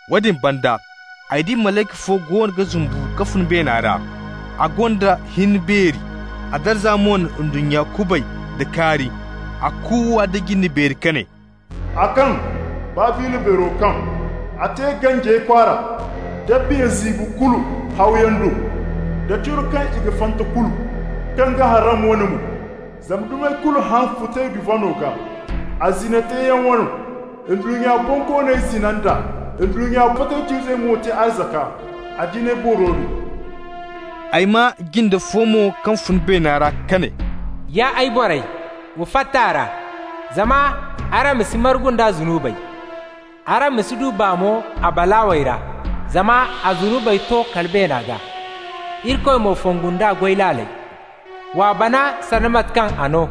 Woodin banda ay di malayka fo goono ga zumbu ka fun beena ra. A gonda hin beeri, a darza mo na ndunnya kubay nda kaari. A kuuwa nda jinde beeri ka ne: «A kaŋ! Babila beero kaŋ! A te ganjey kwaara da biya ziibo kulu hawyaŋ do, da curo kaŋ i ga fanta kulu kaŋ ga harram wane mo. Zama dumey kulu haŋ futay duvaŋo gaa, a zina teeyaŋ wano. Ndunnya bonkooney zina nd'a, ndunnya fatawc'izey mo te arzaka a jinay booro do.» Ay maa jinde fo mo kaŋ fun beena ra ka ne: «Ya ay borey, wa fatta a ra, zama araŋ ma si margu nd'a zunubey. Araŋ ma si du baa mo a balaawey ra. Zama a zunubey to kala beena gaa, Irikoy mo fongu nd'a goy laaley. W'a bana sanda mate kaŋ a no,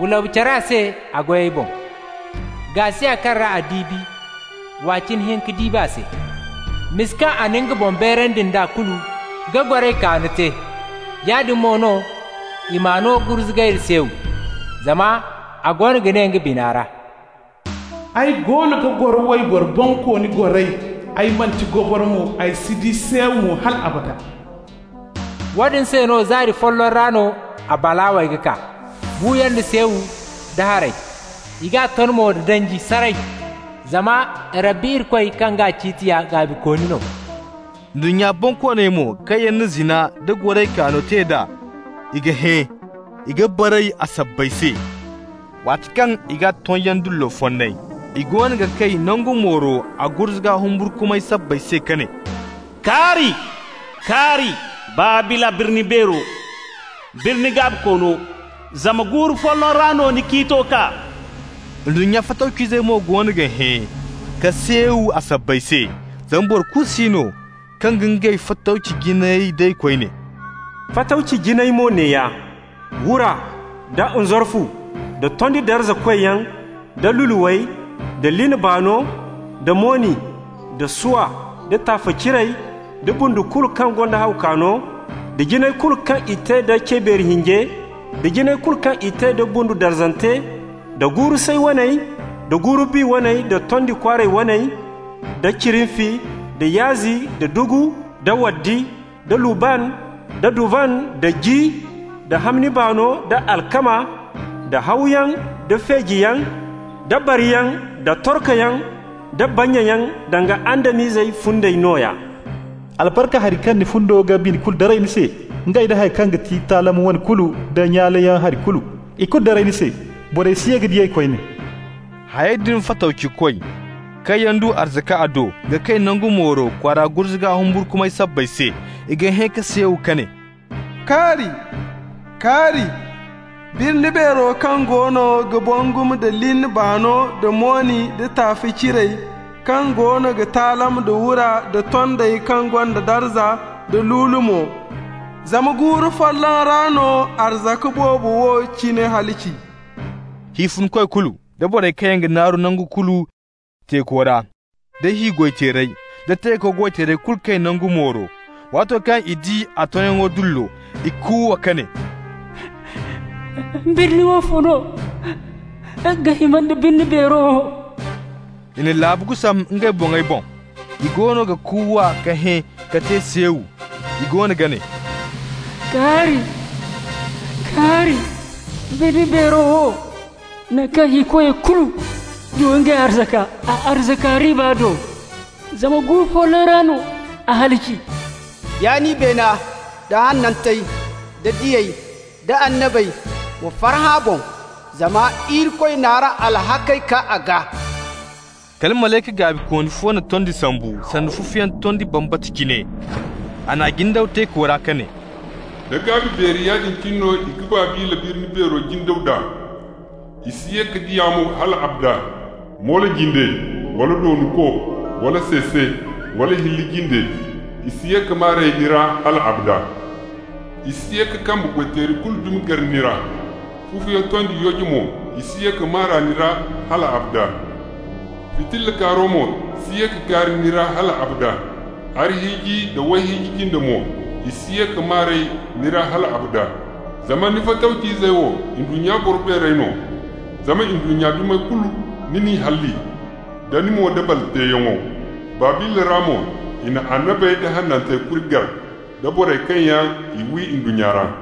wa labu-care a se a goyey boŋ. Gaasiya kaŋ ra a diibi, w'a cine hinka diibi a se. Misa kaŋ a na nga boŋ beerandi nd'a kulu, ka goray kaano te, yaadin mo no i m'a no gurzugay da seew. Zama a goono ga ne nga bina ra: ‹Ay goono ga goro wayboro bonkooni goray! Ay manti goboro mo, ay si di seew mo hal abada.› Woodin se no zaari folloŋ ra no a balaawey ga kaa: buuyaŋ da seew da haray. I g'a ton mo da danji, saray! Zama Rabbi Irikoy kaŋ g'a ciiti ya gaabikooni no.» Ndunnya bonkooney mo kaŋ yaŋ na zina nda goray kaano te d'a, i ga hẽ, i ga baray a sabbay se, waati kaŋ i g'a tonyaŋ dullo fonnay. I goono ga kay nangu mooro a gurzuga humburkumay sabbay se ka ne: «Kaari! Kaari! Babila birni beero, birni gaabikoono. Zama guuru folloŋ ra no ni ciito kaa.» Ndunnya fatawc'izey mo goono ga hẽ ka seew a sabbay se, zama boro kulu si no kaŋ ga ngey fatawci jinayey day koyne. Fatawci jinayey mo neeya: wura, da nzarfu, da tondi darzakoy yaŋ, da luluwey, da lin baano, da moni, da swa, da taafe ciray, da bundu kulu kaŋ gonda haw kaano, da jinay kulu kaŋ i te da cebeeri hinje, da jinay kulu kaŋ i te da bundu darzante, da guuru-say waney, da guuru-bi waney da tondi kwaaray waney, da cirinfi, da yaazi, da dugu, da waddi, da lubban, da duvan, da ji, da hamni baano, da alkama, da hawyaŋ, da feejiyaŋ, da bariyaŋ, da torkoyaŋ, da bannyayaŋ, danga Adam-izey fundey nooya. Albarka hari kaŋ ni fundo ga bini kulu daray ni se, ngey nda haŋ kaŋ ga ti taalam wane kulu, da nyaaleyaŋ hari kulu -- ikulu daray ni se. Borey si ye ka di ey koyne. Hayey din fatawcikoy, kaŋ yaŋ du arzaka a do, ga kay nangu mooro kwaara gurzuga humburkumay sabbay se. I ga hẽ ka seew ka ne: «Kaari! Kaari! Birni beero kaŋ goono ga bangum da lin baano da moni da taafe ciray, kaŋ goono ga taalam da wura nda tondey kaŋ gonda darza, da lulu mo! Zama guuru folloŋ ra no arzaka boobo wo cine halaci.» Hi funkoy kulu, da borey kaŋ yaŋ ga naaru nangu kulu teeko ra, da hi goy-teerey, da teeko goy-teerey kulu kay nangu mooro. Waato kaŋ i di a tonyaŋ dullo, i kuuwa ka ne: «Birni woofo no ga hima nda birni beero wo?» I na laabu gusam ngey boŋey boŋ. I goono ga kuuwa ka hẽ ka te seew. I goono ga ne: «Kaari! Kaari! Birni beero wo, naŋ kaŋ hikoyey kulu du ngey arzaka a arzaka riiba do! Zama guuru folloŋ ra no a halaci. Ya nin beena, da hanantey, da diyey, da annabey, wa farhã a boŋ, zama Irikoy n'araŋ alhakkey kaa a gaa.» Kala malayka gaabikooni fo na tondi sambu, sanda fufuyaŋ tondi bambata cine. A n'a jindaw teeko ra ka ne: «Da gaabi beeri yaadin cine no i ga Babila birni beero jindaw nd'a. I si ye ka di a mo hal abada. Moolo jinde, wala doonko, wala seese, wala hilli jinde, i si ye ka maa r'ey ni ra hal abada. I si ye ka kambe goy-teeri kulu dumi gar ni ra. Fufuyaŋ tondi yooje mo, i si ye ka maa r'a ni ra hal abada. Fitilla kaaro mo si ye ka kaari ni ra hal abada. Arhiiji da wayhiiji jinde mo, i si ye ka maa r'ey ni ra hal abada. Zama ni fatawc'izey wo ndunnya boro beerey no, zama ndunnya dumey kulu, ni n'i halli nda ni moodabal teeyaŋo. Babila ra mo, i na annabey da hanantey kuri gar, da borey kaŋ yaŋ i wi ndunnya ra.»